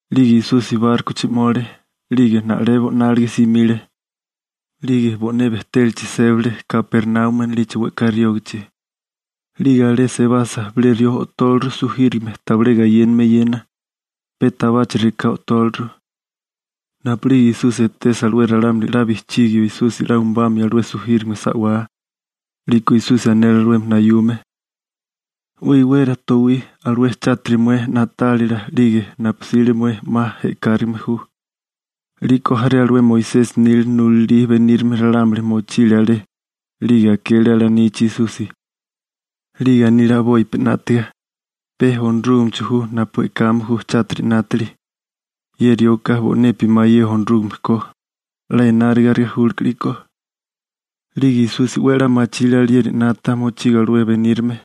'Lige Esusi bárkochi 'mole, 'lige na'lebo 'nálige simile. 'Lige bo'né bejtélachi sébale Kapernaumi anilichi we'ká riógichi. 'Lige alé sebasa, bilé rió o'tóleru sujírigame tabilé gayéname eyena. Pe tabachi rekagá o'tóleru. Napu'lige Esusi etesa alué ralámuli 'la bijchígio Esusi 'la umabamio alué sujírigame sa'wá, 'liko Esusi anele alué nayume: ―'We iwera towí, alué chátiri mué na'tálila 'lige napu 'sile mué 'ma e'kárigime ju. 'Liko jaré alué Moisesi nila nulalí benírame ralámuli mochile alé, 'lige akele alanichi Esusi, 'lige anile a'bopi 'nátaga: «Pe Onorúgamecho ju napu e'kame ju chátiri 'nátili. Ye rioka bo'nepi mayé Onorúgame ko. 'La enárigarigá julke 'liko.» 'Lige Esusi 'we a'lá machile alieri 'nata mochigo alué benírame.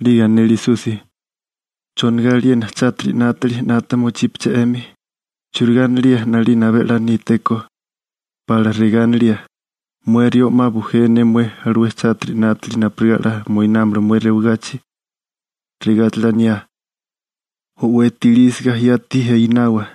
'Lige anele Esusi: ―¿Chonigá aliena chátiri 'nátili 'nata mochípeché 'emi? ¿Churigá anilía 'nalina abé a'lá nítéko? ¿Pa'lá regá anilía: «Mué rió 'ma bujé ne mué alué chátiri 'nátili napurigá 'la moinámala mué rewagachi», regáchala aniá: «O'weti ilísiga yati einawa»?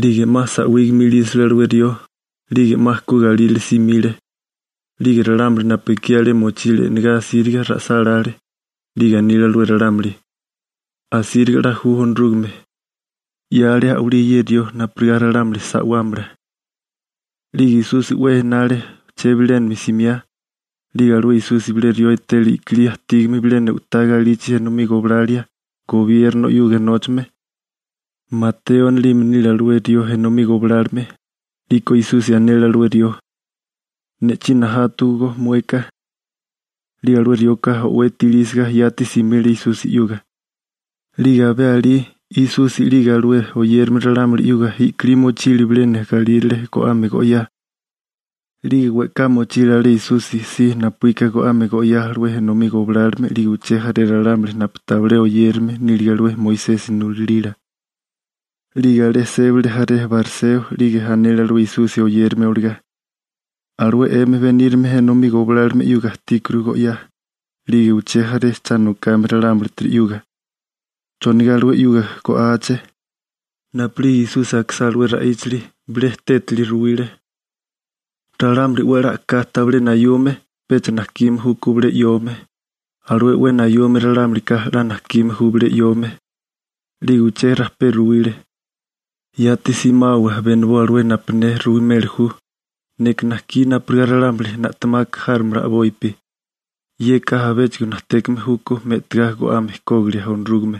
'Lige 'ma sa'wígame ilísale alué rió, 'lige 'ma ku galírale simile. 'Lige ralámuli napu ekí alé mochílige e'negá asíriga ra'sálále. 'Lige anile alué ralámuli: ―Asíriga 'la ju Onorúgame, 'yale a'walí ye rió napurigá ralámuli sa'wámala. 'Lige Esusi 'we enale chebilénami simiá, 'lige alué Esusi bilé rió etele i'kilí ajtígame bilena u'tá galichi enomí goblalia, gobierno 'yuga nóchame. Mateo anilime nile alué rió enomí goblálome. 'Liko Esusi anele alué rió: ―Nabá ne 'yuga. 'Lige alué rioka o'weti ilísiga yati simile Esusi 'yuga. 'Lige abé alí, Esusi 'lige alué oyérame ralámuli 'yuga i'kilí mochile bilena galírale go'ame go'yá. 'Lige we'ká mochile alé Esusi si napuíka go'ame go'yá alué enomí goblálome 'lige uché jaré ralámuli napu tabilé oyérame nílige alué Moisesi nulalila. 'Lige alé sébale jaré bariseo, 'lige anele alué Esusi oyérame olagá: ―Alué 'emi benírame enomí goblálome 'yuga ajtíkuru go'yá, 'lige uché jaré cha nokame ralámulitiri 'yuga. ¿Chonigá alué 'yuga go'áaché? Napu'lige Esusi akisá alué ra'íchali, bilé tétali ruwile: ―Ralámuli 'we a'lá a'ká tabilé nayume, pecha najkime júkó bilé 'yome. Alué 'we nayume ralámulika, 'la najkime ju bilé 'yome. 'Lige uché rajpé ruwile: ―Yati simawa beniboa alué napu ne ruimeli ju: «Neka najkí napurigá ralámuli na'temaka járomala a'bopi. Yeka abéchigo najtékame júkó me'tigá go'ame kógilia Onorúgame.»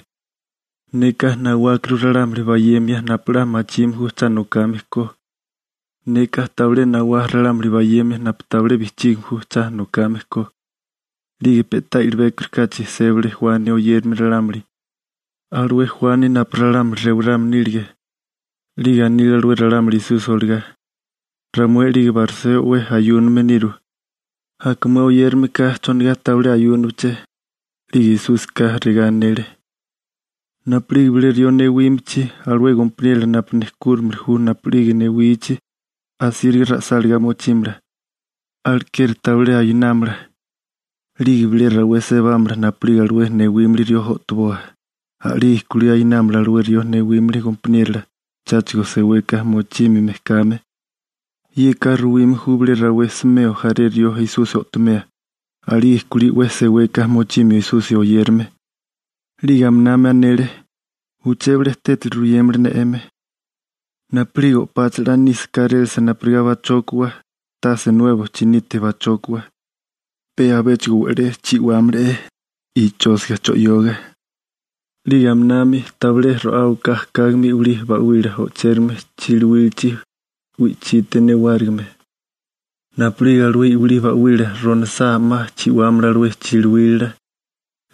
Neka nawákuru ralámuli bayemia napu 'la machime ju cha nokame ko. Neka tabilé nawá ralámuli bayemia napu tabilé bijchígame ju cha nokame ko. 'Lige pe'tá i'libékorikáchi sébale Juani oyérame ralámuli, alué Juani napu ralámuli rewarame nílige. 'Lige anile alué ralámuli Esusi olagá: ―Ramué 'lige bariseo 'we ayúname niru. Aka mué oyérameka, ¿chonigá tabilé ayúnabeché? 'Lige Esúsika regá anele: ―Napu'lige bilé rió newímichi, alué gompaniérola napu nejkúrimili ju napu'lige newichi, asíriga ra'sáligá mochímala. Alekeri tabilé ayunámala. 'Lige bilé rawé sebámala napu'lige alué newímili rió o'toboa. A'lige kulí ayunámala alué rió newímili gompaniérola, cháchigo seweka mochímime kame. (Yeka ruwime ju bilé rawé smeo jaré rió Esusi o'tomea. A'lige kulí 'we seweka mochimio Esusi oyérame.) 'Lige aminami anele: ―Uché bilé tétali ruyémala ne 'emi. Napu'lige o'páchala 'la nisa kárélasa napurigá pachókawa, tase nuebo chinite pachókawa, pe abéchigo we'lé chi'wámala'é ichósiga cho'yoga. 'Lige aminami tabilé ro'áwaká ajkágame i'wilí ba'wila o'chérame chiliwílachi wi'chite newárigime. Napu'lige alué i'wilí ba'wila ronasá 'ma chi'wámala alué chiliwila.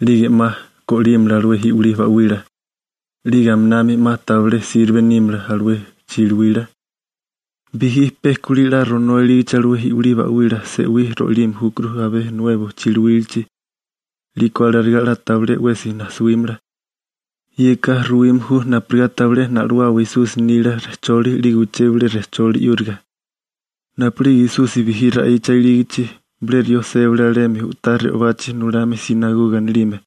'Lige 'ma go'límala alué i'wilí ba'wila. 'Lige aminami 'ma tabilé sirbe nímala alué chiliwila. Bijí pe kulí 'la ronoa ilígichi alué i'wilí ba'wila se'wí ro'ilime júkuru abé nuebo chiliwílachi, 'liko alarigá 'la tabilé 'wesi najsawímala. Yeka ruwime ju napurigá tabilé na'lowawa Esusi nila rejcholi 'lige uché bilé rejcholi 'yúriga. Napu'lige Esusi bijí ra'icha ilígichi, bilé rió sébale alemi u'tá re'obachi nulame «sinagoga» anilime,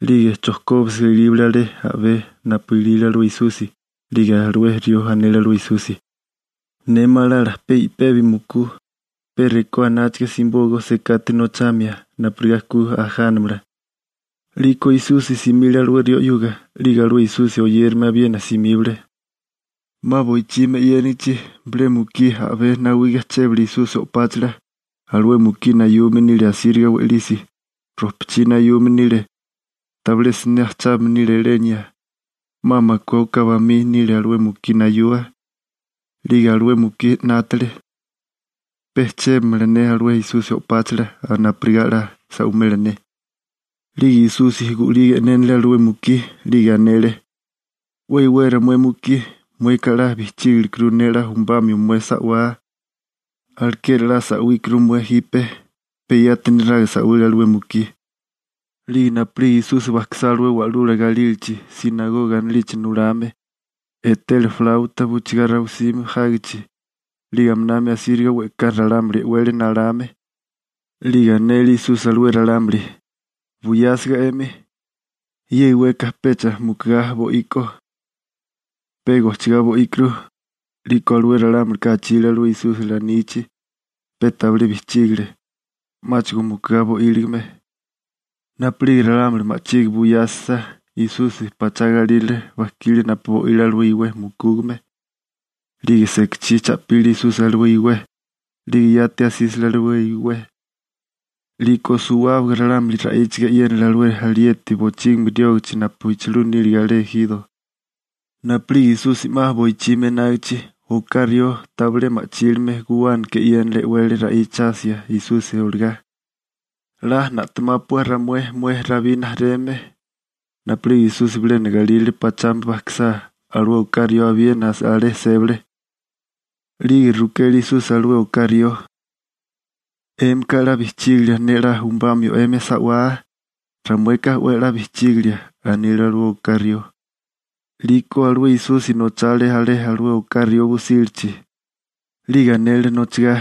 'lige chojkóbisiga ilíbale alé a'bé napu ilile alué Esusi, 'lige alué rió anele alué Esusi: ―Ne malala pe i'pebi mukú, pe rekó anáchaga, simibóaká sekate nochamia napurigá ku ajánamala. 'Liko Esusi simile alué rió 'yuga, 'lige alué Esusi oyérame abiena simíbale. 'Ma boichimi 'yénigichi, bilé mukí a'bé nawiga chébale Esusi o'páchala. Alué mukí nayume nile asíriga we'lisi, rojpachí nayume nile, tabilé siné ajchábame nile elenia, 'ma makué oká bamí nile alué mukí nayua. 'Lige alué mukí 'nátale: «Pe chébamala ne alué Esusi o'páchala napurigá 'la sa'wimela ne.» 'Lige Esusi gu'liga e'nénale alué mukí, 'lige anele: ―'We iwera mué mukí. Mueka 'la bijchígalekurú ne 'la umabamio mué sa'wá, alekeri 'la sa'wíkurú mué jipe. Pe yati neraga sa'wile alué mukí. 'Lige napu'lige Esusi bajkisá alué wa'lula galílachi, «sinagoga» anilichi nulame, etele «flauta» bujchigá rabisime jágichi, 'lige aminami asíriga we'ká ralámuli e'wele nalame. 'Lige anele Esusi alué ralámuli: ―Buyásiga 'emi. Ye iweka pecha mukigá bo'iko, pe gojchigá bo'íkurú. 'Liko alué ralámuli achile alué Esusi lanichi, pe tabilé bijchígale, 'máchigo mukugá bo'íligame. Napu'lige ralámuli ma'chige buyasa Esusi pachá galírale bajkile napu bo'ile alué iwé mukúgame. 'Lige sekachí cha'pile Esusi alué iwé, 'lige yati asísale alué iwé. 'Liko suwábaga ralámuli ra'íchiga e'yénale alué alieti bochígimi riógachi napu echulú nílige alé ejiro. Napu'lige Esusi 'ma boichimi enágichi, oká rió tabilé ma'chílime guwánaka e'yénale e'wele ra'ichasia Esusi olagá: ―¡'La na'temápua ramué, mué Rabí rijimala! Napu'lige Esusi bilena galírale pachami bajkisá, alué oká rió abiena alé sébale. 'Lige rukele Esusi alué oká rió: ―¿'Émika 'la bijchígilia ne 'la umabamio 'emi sa'wá? ―Ramueka 'we a'lá bijchígilia ―anile alué oká rió. 'Liko alué Esusi nochale alé alué oká rió busílachi. 'Lige anele nochagá: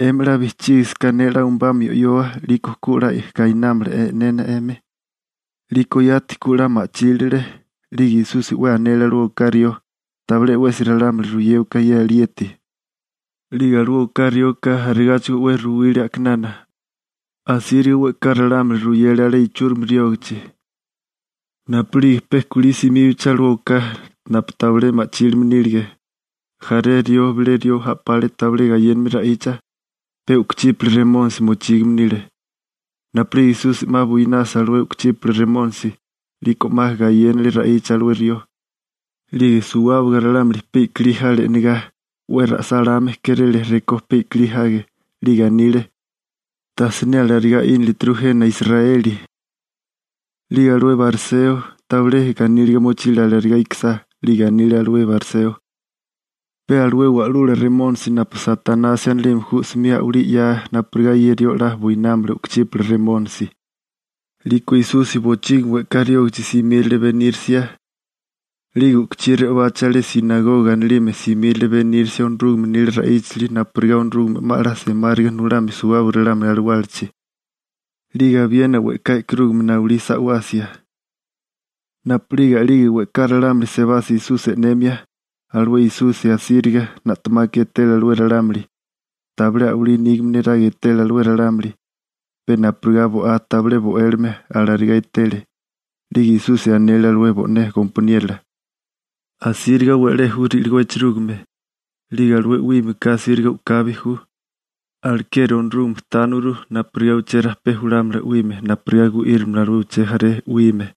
―'Emi 'la bijchígasaká ne 'la umabamio 'yoa, 'liko ku 'la gainámala e'nena 'emi. 'Liko yati ku 'la ma'chílale. 'Lige Esusi 'we anele alué oká rió: ―Tabilé 'wesi ralámuli ruyéwaká ye alieti. 'Lige alué oká rioka arigáchigo 'we ruwile a'kinana, asíriga we'ká ralámuli ruyele alé ichúrimi riógichi. Napu'lige pe kulí simíbachi alué oká napu tabilé ma'chílime nílige, jaré rió bilé rió a'pale tabilé gayéname ra'icha, pe u'kuchípala remónisi mochígame nile. Napu'lige Esusi 'ma buinasa alué u'kuchípala remónisi, 'liko 'ma gayénale ra'icha alué rió. 'Lige suwábaga ralámuli pe i'kilí jale e'negá, 'we ra'sáláme kéréle rekó pe i'kilí jage, 'lige anile: ―Tajsiné alarigá 'ínilituru jena Israeli. 'Lige alué bariseo tabilé ganíliga mochile alarigá ikisá. 'Lige anile alué bariseo: ―Pe alué wa'lula remónisi napu Satanasi anilime ju 'smi a'walí 'yaa napurigá ye rió 'la buinámala u'kuchípala remónisi. 'Liko Esusi bochígimi we'ká riógachi simírale benírisia, 'lige u'kuchí re'obachi alé «sinagoga» anilime simírale benírisia Onorúgame nila ra'íchali napurigá Onorúgame 'ma 'la semáriga nulamio suwábaga ralámuli alawálachi, 'lige abiena we'ká e'karúgame nawalí sa'wasia. Napu'lige we'ká ralámuli sebasa Esusi e'nemia, alué Esusi asíriga na'temaka etele alué ralámuli, tabilé a'walí nígame niraga etele alué ralámuli, pe napurigá bo'á tabilé bo'élime, alarigá etele. 'Lige Esusi anele alué bo'né gompaniérola: ―Asíriga we'lé ju ri'ligó echerúgime, 'lige alué 'wímeka asíriga u'kabi ju. Alekeri Onorúgame tániwaguru napurigá uché rajpé julámala 'wime napurigá gu'írimala alué uché jaré 'wime.